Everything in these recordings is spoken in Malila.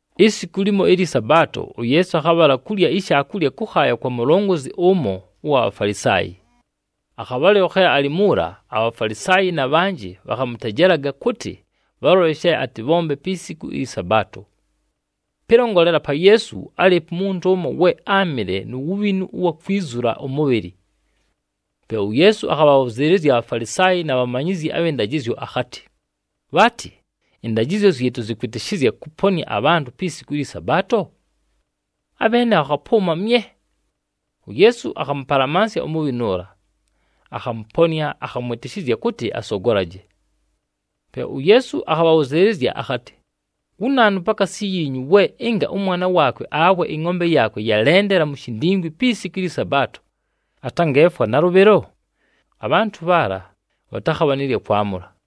Isiku limo ɨlyɨ Sabaato, uYeesu akhabhala kulya ishaakulya kʉkhaaya kwa mulongozi ʉmo ʉwa Bhafalisaayi. Akhabhalɨlo khe alɨ muula, aBhafalisaayi na bhanjɨ bhakhamʉtejelaga kʉtɨ bhalole she atɨbhombe pi siku ɨlyɨ Sabaato. Pɨlongolela pa Yeesu, álɨɨpo umuntu ʉmo, we áamɨle nu wubhinu ʉwa kwizula ʉmʉbhɨlɨ. Pe uYeesu akhabhabhʉzɨɨlɨzya aBhafalisaayi na bhamanyizyi abhɨ ndajɨzyo akhatɨ, “Bhaatɨ, ɨndajɨzyo zyɨtʉ zɨkʉtwɨtɨshɨzya kʉponɨa abhantʉ pi siku ɨlyɨ Sabaato?” Abheene bhakhapʉʉma mye. UYeesu akhamʉpalamansya umubhinu ʉla, akhamʉponɨa, akhamwɨtɨshɨzya kʉtɨ asogolaje. Pe uYeesu akhabhabhʉzɨɨlɨzya akhatɨ, “Wu naanu pakaasi yiinyu we ɨnga ʉmwana waakwe awe ɨngʼombe yaakwe yalendela mu shindingwi pi siku ɨlyɨ Sabaato, atangeefwa nalʉbhɨlo?” Abhantʉ bhaala, bhatakhabha nɨ lya kwamʉla.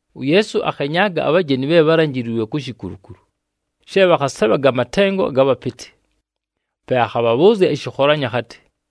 UYeesu akhenyaaga abhajeni bhe bhálanjiliilwe ku shikulukulu, she bhakhasebhaga amatengo aga bhapɨtɨ. Pe akhabhabhʉʉzya ɨshɨkholanyo akhatɨ,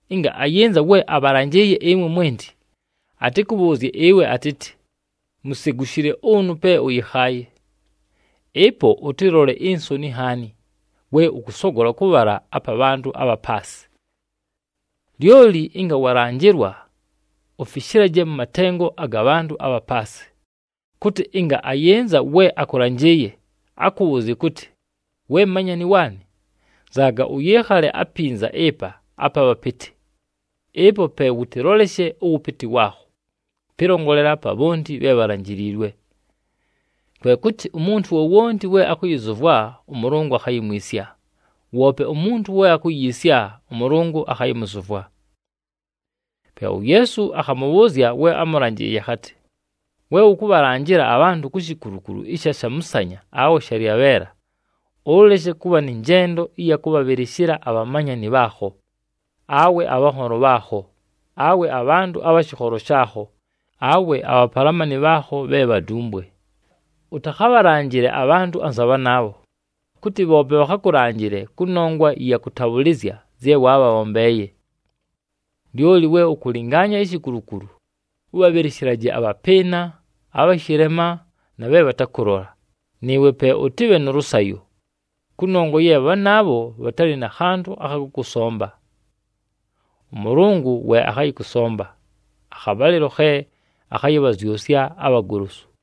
Ɨnga ayɨnza we abhalanjɨɨye ɨmwe mwenti, atɨkʉbhʉʉzye ɨwe atɨtɨ, ‘Musegushile ʉnʉ pe ʉyɨkhaaye.’ Ɨpo, ʉtɨlole insoni nhaani, we ʉkʉsogola kʉbhala apa bhantʉ abha paasɨ. “Lyoli ɨnga walanjɨlwa, ufishilaje mʉ matengo aga bhantʉ abha paasɨ, kʉtɨ ɨnga ayɨnza we akʉlanjɨɨye, akʉbhʉʉzye kʉtɨ, ‘Weeya manyani waanɨ, nzaaga ʉyɨɨkhale apinza ɨpa apa bhapɨtɨ.’ Ɨpo pe wʉtɨloleshe ʉwʉpɨtɨ waakho, pɨlongolela pa bhonti bhe bhalanjiliilwe. Kwe kʉtɨ, umuntu wowonti we akʉyɨzʉvwa, ʉMʉlʉngʉ akhayimwisya. Woope umuntu we akuyiisya, ʉMʉlʉngʉ akhayɨmʉzʉvwa.” Pe uYeesu akhamʉbhʉʉzya we amʉlanjɨɨye akhatɨ, “We ʉkʉbhalanjɨla abhantʉ ku shikulukulu ɨsha shamʉsanya awe shalyabheela, ʉleshe kʉbha nɨ njendo ɨya kʉbhabhɨlɨshɨla abhamanyani bhaakho, awe abhanholo bhaakho, awe abhantʉ abha shɨkholo shaakho, awe abhapalamani bhaakho bhe bhadumbwe. Ʉtakhabhalanjɨle abhantʉ anza bhanaabho, kʉtɨ bhoope bhakhakʉlanjɨle kʉnongwa ɨya kʉtabhʉlɨzya zye waabhabhombeeye. Lyoli we ʉkʉlɨngaanya ishikulukulu, ʉbhabhɨlɨshɨlaje abhapɨɨna, abha shɨlema, na bhe bhatakʉlola, nɨɨwe pe ʉtɨbhe nʉ lʉsayo, kʉnongwa ye bhanaabho bhatalɨ na khantʉ akha kʉkʉsomba. ɄMʉlʉngʉ we akhayɨkʉsomba, akhabhalɨlo khe akhayɨbhazyʉsya abhagolosu.”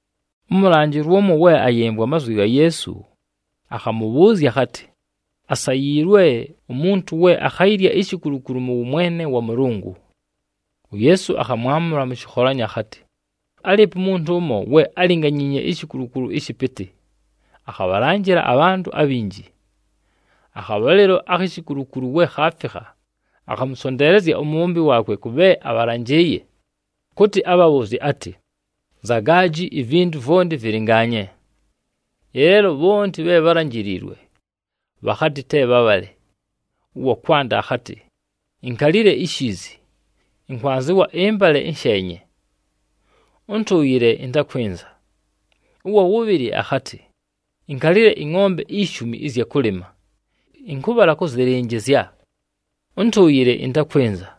Ʉmʉlanjɨlwa ʉmo we ayɨmvwa amazwi ga Yeesu, akhamʉbhʉʉzya akhatɨ, “Asayiilwe, umuntu we akhayilya ishikulukulu mʉ wʉmwene wa Mʉlʉngʉ!” UYeesu akhamwamʉla mʉ shɨkholanyo akhatɨ, “Álɨɨpo umuntu ʉmo, we álinganyiinye ishikulukulu ɨshɨpɨtɨ, akhabhalanjɨla abhantʉ abhinji. Akhabhalɨlo akhi shikulukulu we khaafikha, akhamʉsonteelezya umubhombi waakwe kʉ bhe abhalanjɨɨye, kʉtɨ abhabhʉʉzye atɨ, ‘Nzaagaji, ivintu vwonti vɨlɨngaanye!’ “Ɨleelo bhonti bhe bhálanjiliilwe, bhakhatɨ te bhabhale. Ʉwa kwanda akhatɨ, ‘Inkalile ishiizi, ɨnkwanzɨwa ɨmbale ɨnsheenye. Ʉntʉʉyɨle ɨntakwɨnza.’ Ʉwa wʉbhɨlɨ akhatɨ, ‘Inkalile ɨngʼombe ishumi ɨzya kʉlɨma, ɨnkʉbhala kʉzɨlɨnjɨzya. Ʉntʉʉyɨle ɨntakwɨnza.’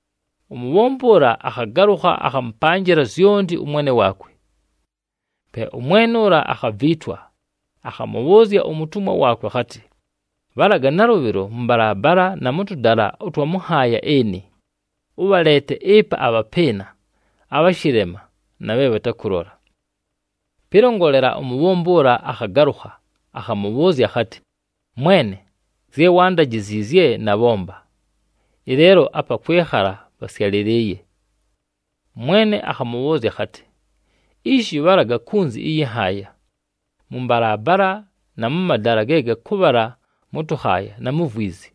“Umubhombi ʉla akhagalʉkha, akhamʉpanjɨla zyonti ʉmwene waakwe. Pe ʉmwene ʉla akhaviitwa, akhamʉbhʉʉzya umutumwa waakwe akhatɨ, ‘Bhalaga nalʉbhɨlo mʉ mbalaabala na mʉ tʉdala ʉtwa mʉ nhaaya ɨnɨ, ʉbhaleete ɨpa abhapɨɨna, abha shɨlema na bhe bhatakʉlola.’ “Pɨlongolela, umubhombi ʉla akhagalʉkha, akhamʉbhʉʉzya akhatɨ, ‘Mwene, zye waandajiziizye nabhomba, ɨleelo apa kwɨkhala pasyalɨlɨɨye.’ “Ʉmwene akhamʉbhʉʉzya akhatɨ, ‘Ishi! Bhalaga kunzi ɨyɨ nhaaya, mʉ mbalaabala na mʉ madala ge gakʉbhala mʉ tʉkhaaya, na mu vwizi,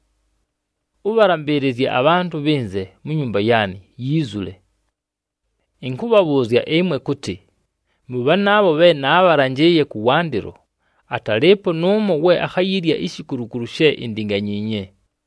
ʉbhalambɨɨlɨzye abhantʉ bhɨnze mu nyumba yaanɨ, yiizule. Ɨnkʉbhabhʉʉzya ɨmwe kʉtɨ, mʉ bhanaabho bhe naabhalanjɨɨye kʉwandɨlo, atalɨɨpo nʉʉmo we akhayilya ishikulukulu she indinganyiinye!’”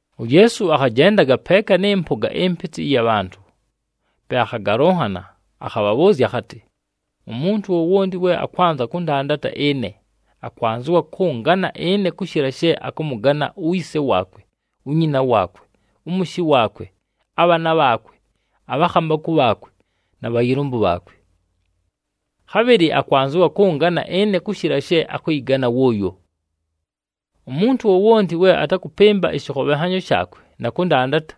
UYeesu akhajendaga peeka nɨ mpʉga ɨmpɨtɨ ɨya bhantʉ. Pe akhagalʉnhana, akhabhabhʉʉzya akhatɨ, “Umuntu wowonti we akwanza kʉndandata ɨne, akwanzɨwa kʉngana ɨne kʉshɨla she akʉmʉgana uyise waakwe, unyina waakwe, ʉmʉshɨ waakwe, abhaana bhaakwe, abhakhambakʉ bhaakwe, na bhayɨlʉmbʉ bhaakwe. Khabhɨlɨ akwanzɨwa kʉngana ɨne kʉshɨla she akʉyɨgana wʉʉyo. Umuntu wowonti we atakʉpɨmba ɨshɨkhobhenhanyo shaakwe na kʉndandata,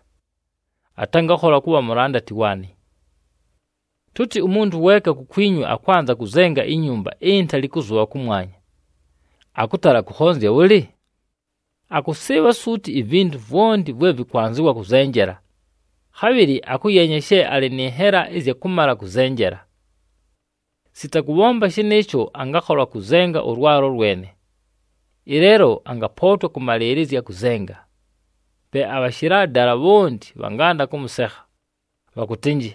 atangakhola kʉbha mulandati waanɨ. “Tʉtɨ umuntu weeka kukwinyu akwanza kʉzenga inyumba intali kʉzʉbha kʉmwanya. Akʉtala kʉkhonzya bhʉlɨ? Akʉsɨɨbha suuti ivintu vwonti vwe vɨkwanzɨwa kʉzenjela, khabhɨlɨ akʉyeenya she alɨ nɨ nhela ɨzya kʉmala kʉzenjela. Sita kʉbhomba shɨnɨɨsho, angakhola kʉzenga ʉlwalo lwene, ɨleelo angapootwa kʉmalɨɨlɨzya kʉzenga. Pe abhashɨla dala bhonti bhanganda kʉmʉsekha, kʉtɨ,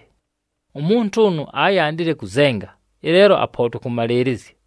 ‘Umuntu ʉnʉ áyandile kʉzenga, ɨleelo apootwa kʉmalɨɨlɨzya!’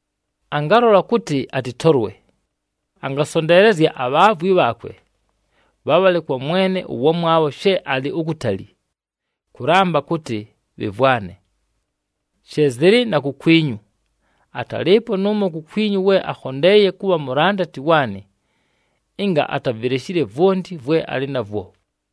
Angalola kʉtɨ atɨtolwe, angasonteelezya abhaavwi bhaakwe, bhabhale kwa mwene ʉwamwabho she alɨ ukutali, kʉlamba kʉtɨ bhɨmvwane. “She zɨlɨ na kukwinyu. Atalɨɨpo nʉʉmo kukwinyu we akhondeeye kʉbha mulandati waanɨ, ɨnga atavileshile vwonti vwe alɨ navwo.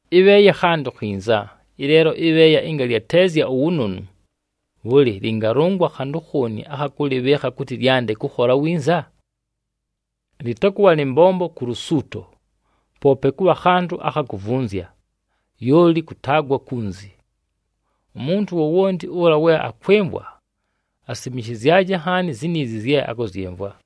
“Ɨbheeya khantʉ khinza. Ɨleelo ɨbheeya ɨnga lyateezya uwunonu, bhʉlɨ lɨngalʉngwa khantʉ khooni akha kʉlɨbhɨɨkha kʉtɨ lyande kʉkhola winza? Lɨtakʉbha nɨ mbombo ku lusuuto, poope kʉbha khantʉ akha kuvunzya, lyoli kʉtaagwa kunzi. Umuntu wowonti ʉla we akwɨmvwa, asimishizyaje nhaani ziniizi zye akʉzyɨmvwa!”